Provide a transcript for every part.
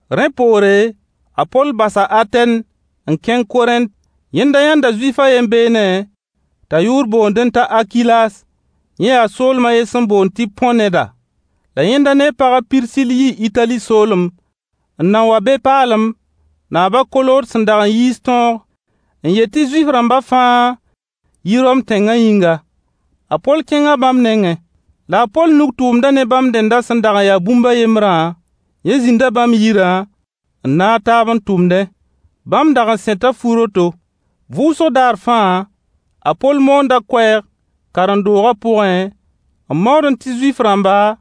Rẽ poore, a Poll basa Atɛn n kẽng Korẽnt. Yẽnda yãnda Zuif a yen beene t'a yʋʋr boondẽ t'a Akilas, yẽ yaa soolem a yen sẽn boond tɩ Põ neda. La yẽnda ne a pag a Pirsill yii Itali soolem n nan wa be paalem, naab a Kolood sẽn dag n yiis tõog n yet tɩ Zuif-rãmba fãa yi Rom tẽnga yĩnga. A Poll kẽnga bãmb nengẽ. La a Poll nug-tʋʋmdã ne bãmb dẽndã sẽn dag n ya bũmb a yembrã, yẽ zĩnda bãmb yirã naag taab n tʋmdẽ. Bãmb dag n sẽta fu-roto. Vʋʋsg daar fãa a Poll moonda koɛɛg karen-doogã pʋgẽ n maoodẽ tɩ Zuif-rãmba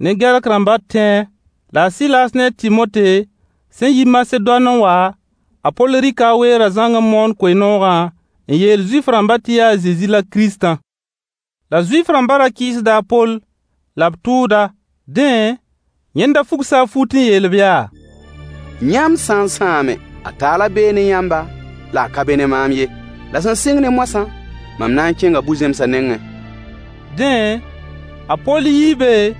ne Gɛrk-rãmba tẽ-a. La a Sɩlaas ne a Tɩmote sẽn yi Masedoan a wa, a Poll rɩka a weerã zãng n moon koe-noogã n yeel Zuif-rãmba tɩ yaa a Zezi la Kiristã. La Zuif-rãmba ra kɩɩsda a Poll la b tʋʋd-a. Dẽ, yẽnda fugsa a fut n yeel-b yaa: Yãmb sã n sãame, a taala bee ne yãmba la a ka be ne maam ye. La sẽn sɩng ne moasã, mam na n kẽnga bu-zẽmsã nengẽ. Dẽ, a Poll yii be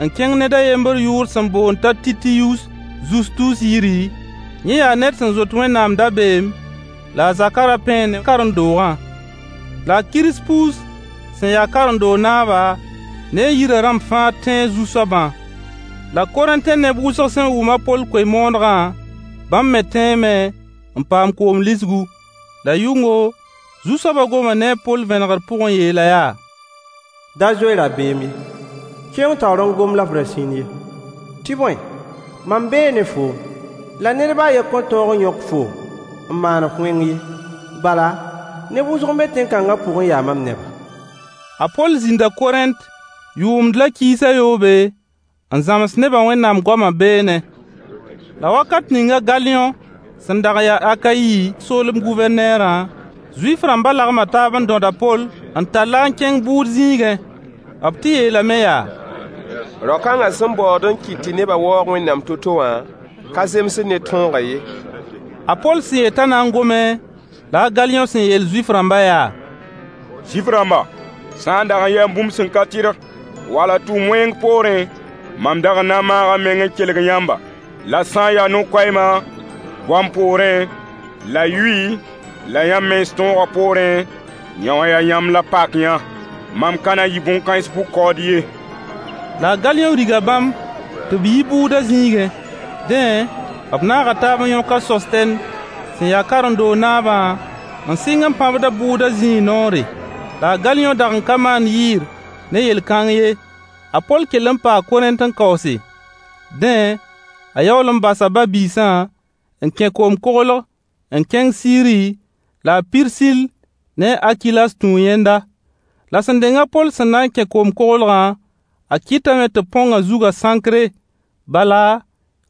n kẽng ned a yembr yʋʋr sẽn boond t'a Titiyuus Zustus yiri, yẽ yaa ned sẽn zoet Wẽnnaam dabeem, la a zakã ra pẽe ne karen-doogã. La a Kirspus sẽn ya karen-doog naaba ne a yirã rãmb fãa tẽe Zu-soabã. La Korẽntẽ neb wʋsg sẽn wʋm a Poll koe-moonegã bãmb me tẽeme n paam koom lisgu. La yʋngo, Zu-soaba goma ne a Poll vẽnegr pʋg n yeel-a yaa: Da zoe rabeem ye, kẽng taoor n gom la f ra sĩnd ye. Tɩ bõe, mam bee ne foom, la ned ba a yen kõn tõog n yõk foom n maan-f wẽng ye, bala, neb wʋsg n be tẽn-kãnga pʋg n ya mam neba. A Poll zĩnda Korẽnt yʋʋmd la kiis a yoobe, n zãms nebã Wẽnnaam goama beene. La wakat ninga a Galiyõ sẽn dag n ya Akayi soolem Gʋvɛrneerã, Zuif-rãmba lagma taab n dõd a Poll n tall a n kẽng bʋʋd zĩigẽ. B tɩ yeelame yaa: Rao-kãnga sẽn baood n kɩt tɩ nebã waoog Wẽnnaam to-to wã ka zemsd ne tõogã ye. A Poll sẽn yet t'a na n gome, la a Galiyõ sẽn yeel Zuif-rãmba yaa: Zuif-rãmba, sã n dag ya bũmb sẽn ka tɩrg wala tʋʋm wẽng poorẽ, mam dag n na n maaga m meng n kelg yãmba. La sã n yaa no-koɛɛma, goam poorẽ, la yʋy la yãmb mens tõogã poorẽ, yõwã yaa yãmb la pak-yã. Mam ka na n yɩ bõn-kãens bʋ-kaood ye. La a Galiyõ riga bãmb tɩ b yi bʋʋda zĩigẽ. Dẽ, b naaga taab n yõk a Sostɛn sẽn ya karen-doog naabã n sɩng n pãbd-a bʋʋda zĩig noore. La a Galiyõ dag n ka maand yɩɩr ne yel-kãng ye. A Poll kell n paa Korẽnt n kaoose. Dẽ, a yaool n basa ba-biisã n kẽ koom-koglg n kẽng Siri la a Pirsill ne a Akilas tũu yẽnda. La sẽn deng a Poll sẽn na n kẽ koom-koglgã, a kɩtame tɩ b põng a zugã Sãnkre, bala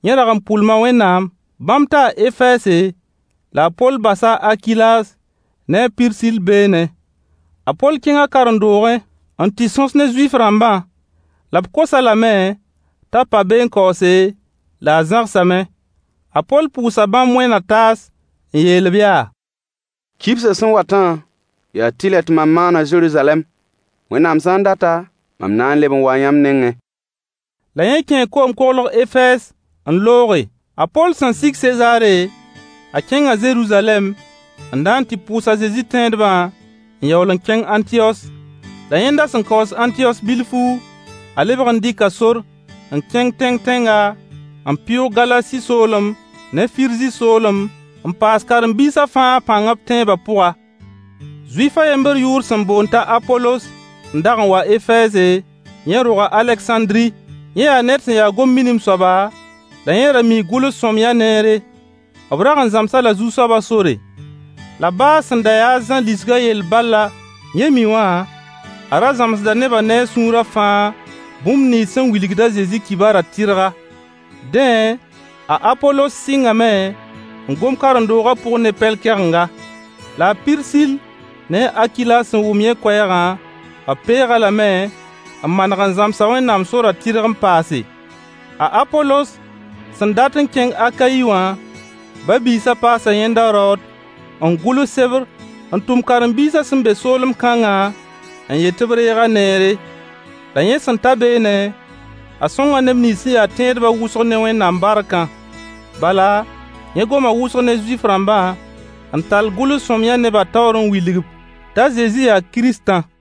yẽ rag n pʋlma Wẽnnaam. Bãmb taa Efɛɛse, la a Poll basa a Akilas ne a Pirsill beene. A Poll kẽnga karen-doogẽ n tɩ sõs ne Zuif-rãmbã. La b kos-a lame t'a pa be n kaoose, la a zãgsame. A Poll pʋʋsa bãmb wẽn-na-taas n yeel-b yaa: [Kibsã sẽn watã, yaa tɩlɛ tɩ mam maan-a Zeruzalɛm.] Wẽnnaam sã n data, mam na n leb n waa yãmb nengẽ. La yẽ kẽe koom-koglg Efɛɛs n looge. A Poll sẽn sig Sezaare, a kẽnga Zeruzalɛm n na n tɩ pʋʋs a Zezi tẽedbã n yaool n kẽng Ãntiyos. La yẽnda sẽn kaoos Ãntiyos bilfu, a lebg n dɩka sor n kẽng tẽng-tẽnga, n pɩʋʋg Galasi soolem ne Firzi soolem n paas karen-biisã fãa pãng b tẽebã pʋga. Zuif a yembr yʋʋr sẽn boond t'a Apolos n dag n wa Efɛɛse, yẽ roga Alegsãndri. Yẽ yaa ned sẽn ya gom-minim soaba la yẽ ra mii gʋls-sõamyã neere. B rag n zãms-a-la Zu-soabã sore. La baa sẽn da yaa a Zã lisgã yell bal la yẽ mi wã, a ra zãmsda neba ne a sũura fãa bũmb nins sẽn wilgd a Zezi kibarã tɩrga. Dẽ, a Apolos sɩngame n gom karen-doogã pʋg ne pɛl-kɛgenga. La a Pirsill ne a Akilas sẽn wʋm yẽ koɛɛgã, b peeg-a lame n maneg n zãms-a Wẽnnaam sorã tɩrg n paase. A Apolos sẽn dat n kẽng Akayi wã, ba-biisã paasa yẽnda raood n gʋls sebr n tʋm karen-biisã sẽn be soolem kãngã n yet tɩ b reeg-a neere. La yẽ sẽn ta beene, a sõnga neb nins sẽn ya tẽedbã wʋsg ne Wẽnnaam barkã. Bala, yẽ goma wʋsg ne Zuif-rãmbã, n tall gʋls-sõamyã nebã taoor n wilg-b t'a Zezi yaa Kiristã.